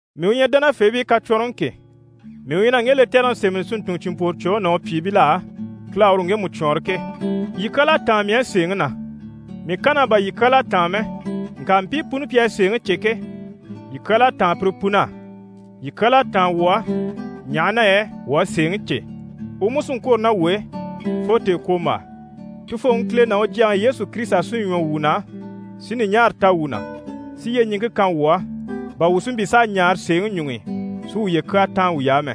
Mii u ɲyɛ dánafeebii kacwɔnrɔŋi ke, mii u ɲyɛ na ŋge lɛtɛrɛŋi sémɛni si ntun cìnmpworocwoŋi ná u pyìibil'á, Kile à uru ŋgemu cwɔɔnrɔ ke. Yii kyal'à táan mii á sèeŋi na. Mii kann'á bà yii kyal'à táan mɛ, ŋka mpii puni pi à sèeŋi cè ke, yii kyal'à táan pire pun'á. Yii kyal'à táan wuu á, ɲaha na yɛ wuu à sèeŋi cè, u mú sí n‑kwôro ná wuu e, fo tèekwombaa. Tufooŋi Kile ná u Jyaŋi Yesu Kirisita sí ɲwɔ wuu na, si ɲùɲaara ta wuu na, si yyeɲiŋke kan wuu á, bà wuu si mpyi s'a ɲaare sèeŋi ɲuŋ'i, si wuye kyaa táan wuy'á mɛ.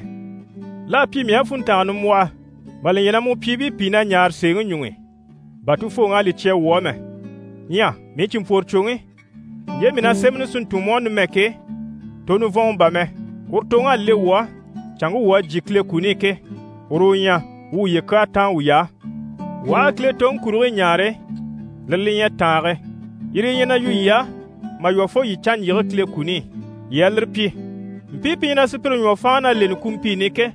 L'à pyi mii á funntanga nimbwɔhɔ, mà li ɲya na mu pyìibii pìi na ɲaare sèeŋi ɲuŋ'i, bà Tufooŋi à li cya wuu á mɛ. Ɲyɛ mii cìnmpworocwoŋi, ɲje mii ɲyɛ na sémɛni si ntun mu á numɛ ke, to nivɔnŋɔ bà mɛ. Uru toŋ'à le wuu á, canŋke wuu à jyè Kile kuni i ke, uru u ɲyɛ: wuu wuye kyaa táan wuy'á. Wuu aha a Kile toŋi kurigii ɲaare, lire li ɲyɛ tàange. Yire yi ɲyɛ na yu yii á, mà lwɔ́ fo yii canɲjyige Kile kuni i, yii a lire pyi. Mpii pi ɲyɛ na sùpyire ɲwɔ fáanŋi na leni kumpiini i ke,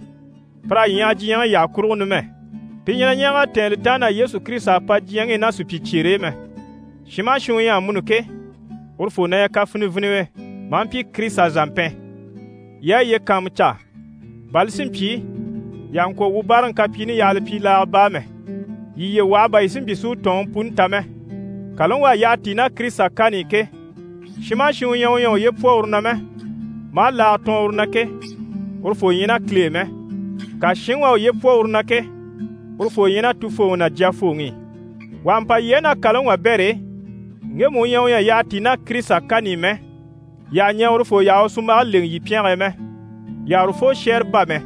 pir'à ɲyaha diɲyɛŋi yyaha kurugo numɛ. Pi ɲyɛ na ɲɛɛg'a tɛ̀ɛn li taan na Yesu Kirisita à pa diɲyɛŋi i ná supyicyeere e mɛ. Shin maha shin u ɲyɛ amuni ke, urufoo na ɲyɛ kafiniviniwe, maa mpyi Kirisita zàmpɛn. Yii a yiye kàanmucaa, bà li si mpyi yii àha ŋkwɔ̀ wuu báaraŋi kapyiini yaha li pyi laaga baa mɛ, yii yiye waha bà yii si mpyi si u tɔ̀ɔnŋi puni ta mɛ. Kàlaŋi u à yyaha tíi ná Kirisita kani i ke, shin maha shin u ɲyɛ u ɲyɛ a uye pwɔ uru na mɛ, maa laaga tɔɔn uru na ke, urufoo ɲyɛ ná Kile e mɛ. Ŋka shinŋi u à uye pwɔ uru na ke, urufoo ɲyɛ ná Tufooŋi ná Jyafooŋi i. Wà ha mpa yii á ná kàlaŋi wabɛr'e, ŋgemu u ɲyɛ u ɲyɛ a yyaha tíi ná Kirisita kani i mɛ, yii àha ɲɛɛ urufoo yaha u sunmbage lèŋɛ yii pyɛnge e mɛ. Yii àha urufoo shɛ́ɛre bá mɛ,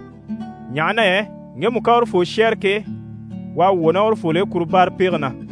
ɲaha na yɛ ŋgemu ká urufoo shɛ́ɛre ke, u à wwɔ̀ ná urufol'e kuru báarapege na.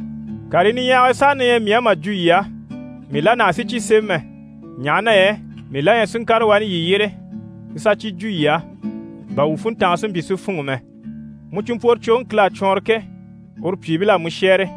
Karii niɲyahagii saha na ɲyɛ mii á mà jwo yii á, mii la nàha si cyi sémɛ mɛ, ɲaha na yɛ mii la ɲyɛ si ŋkàre wani yii yyére si sà cyi jwo yii á, bà wuu funntange si mpyi si fûnŋɔ mɛ. Mu cìnmpworocwoŋi Kile à cwɔɔnrɔ ke, uru pyìibil'à mu shɛ́ɛre.